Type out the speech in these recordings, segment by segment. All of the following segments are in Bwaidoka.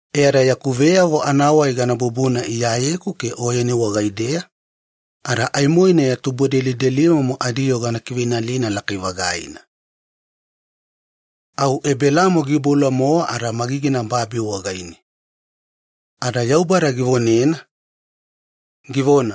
Ada yaku veyavo anavonadabadaba gana bubuna Iyayeku ke Oyeni wagaideya, ada aimoina ya tubudelidelimomo adiyoo gana kiveinalina lakai-vagaina.” Au Ebelamo giiboula-mowa magigina babi wagaine ada Yaubada givonena, givona,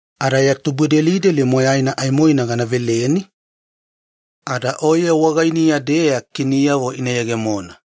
Ada ya tubudelideli moyaina aimoina gana veleni, ada oye wagainiya-deya kiniyavo ina yegemona.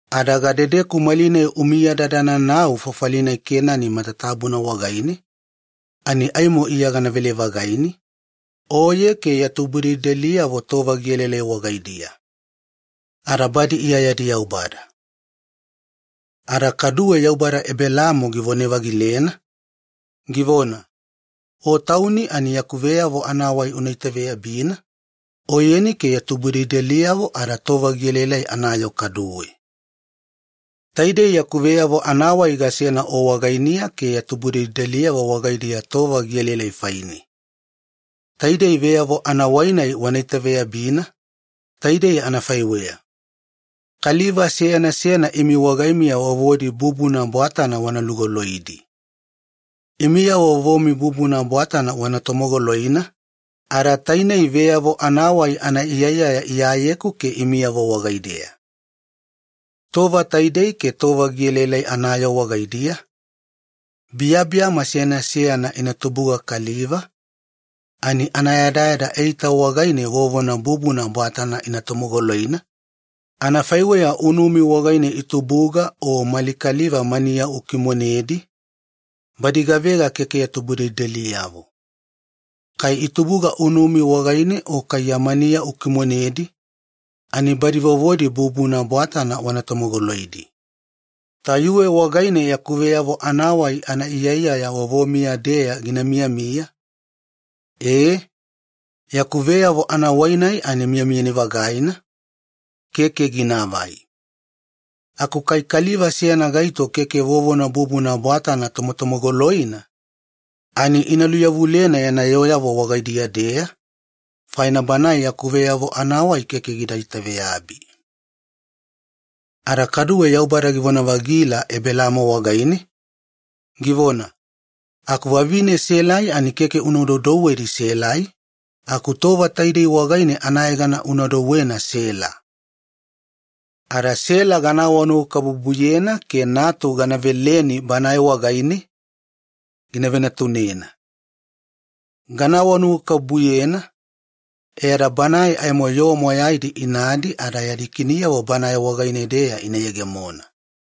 Ada gadedeku malinai umiyadadana nau fafali Kenani matatabuna wagaine, ani aimo Iya ganavele-vagaini, oye ke ya tubudelideliyavo tova gielaelai wagaidiya. Ada badi Iya yadi Yaubada.” Ada kaduwe Yaubada Ebelaamo givone-vagilena, givona, “Aku oye tauni fainiya, yaku veyavo anavonadabadaba una itaveyabina, oyeni ke ya tubudelideliyavo ada tova gielaelai anayoo kaduwe. Taidei yaku veyavo anavonadabadaba gasena wagainiya ke ya tubudelideliyavo wagaidiya tova gielaelai faine, taidei vonadabadaba-nai wana itaveyabina: Kaliva seyana seyana imi wagaimiya vovodi bubuna bwatana wana lugoloidi. Imiyavo vovomi bubuna bwatana wana tomogoloina, tainei veyavo anavonadabadaba anaiyaiyaya, iyayeku ke imiyavo wagaideya. Tova taidei ke tova gielaelai anayoo wagaidiya, biyabiyama seyana seyana ina tubuga kaliva ani anayadayada eita wagaine vovona bubuna bwatana ina tomogoloina, anafaiweya unumi wagaine itubuga o mali kaliva maniya ukimonedi, badi gavega keke ya tubudelideliyavo. Kai itubuga unumi wagaine, o kai ya maniya ukimonedi ani badi vovodi bubuna bwatana wana tomogoloidi. Tayuwe wagaine yaku veyavo anavonadabadaba anaiyaiyaya vovomiya-deya gina vewala tainei yaku vonadabadaba-nai miyamiyani-vagaina keke ginaavai. Aku kai kaliva seyana gaito keke vovona bubuna bwatana tomotomogoloina ina aimo ina luyavulena yana yooyavo wagaidiya-deya, faina banae yaku veyavo anavonadabadaba gidabana.” Ada kaduwe Yaubada givona-vagila Ebelaamo wagaine, givona, “Aku vavine Selai ani keke una doudouwe Selai, aku tova taidei wagaine anayegana una douwena Sela. Ada Sela gana vonanuwakabubuyena ke natu gana veleni banae wagaine, gina venatunena. Gana vonanuwakabubuyena e ada banae aimo yoo moyaidi inadi, ada yadi kiniyavo banae wagaine-deya ina yegemona.”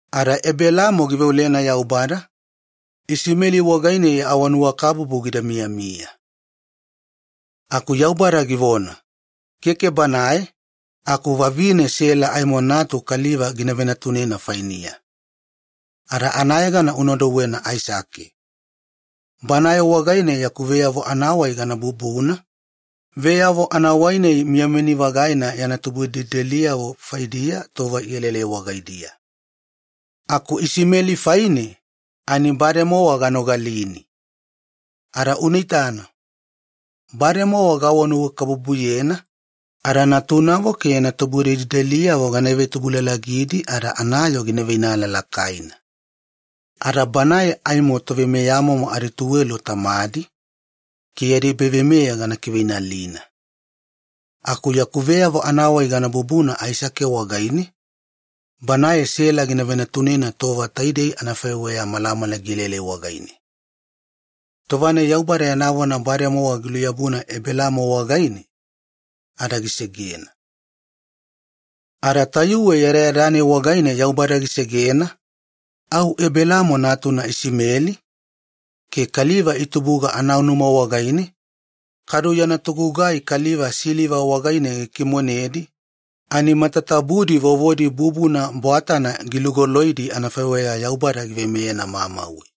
Ada Ebelaamo giveolena Yaubada, “Isimeli wagaine ya vonanuwakabubu anavonadabadaba gida miyamiya.” Aku Yaubada givona, “Keke banae, aku vavine Sela aimo natu kaliva gina venatunena fainiya, ada anayegana una douwena Aisake. Banae wagaine yaku veyavo anavonadabadaba gana kivetoyogina, veyavo-nai miyamiyani-vagaina yana tubudelideliyavo faidiya tova ielaelai wagaidiya. Aku Isimeli faine, ani bademowa ganogalini. Ada unaitana, gana vonanuwakabubuyena velemoena, ada natunavo ke yana tubudelideliyavo gana ivetubulalagina ada anayoo gina veinala lakaina. Ada banae aimo toveimeyamomo adituwelo tamadi, ke yadi ebaveimeya gana kiveinalina. Aku yaku veyavo anavonadabadaba gana kivetoyogina Aisake wagaine, banae Sela gina venatunena tova taidei wagaine aku malamala gielaelai.” Tova-nai Yaubada yana vona bademowa giluyabuna Ebelaamo wagaine, ada gisegena. Ada tayuwe yadayada-nai wagaine Yaubada gisegena, au Ebelaamo gigugai anafaiweya giveimeyena. Ada Ebelaamo natuna Isimeli giabina ke kaliva matatabudi itubuga anaunuma wagaine o siliva wagaine gikimonedi, ani vovodi bubuna bwatana gilugoloidi anafaiweya Yaubada giveimeyena mamauwe.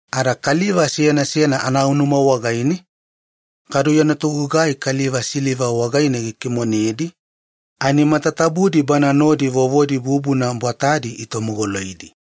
Ada kaliva seyana seyana anaunuma wagaine, anafaiweya mali kaliva aku siliva wagaine gikimonedi, ani bana nodi vovodi bubuna bwatadi itomogoloidi.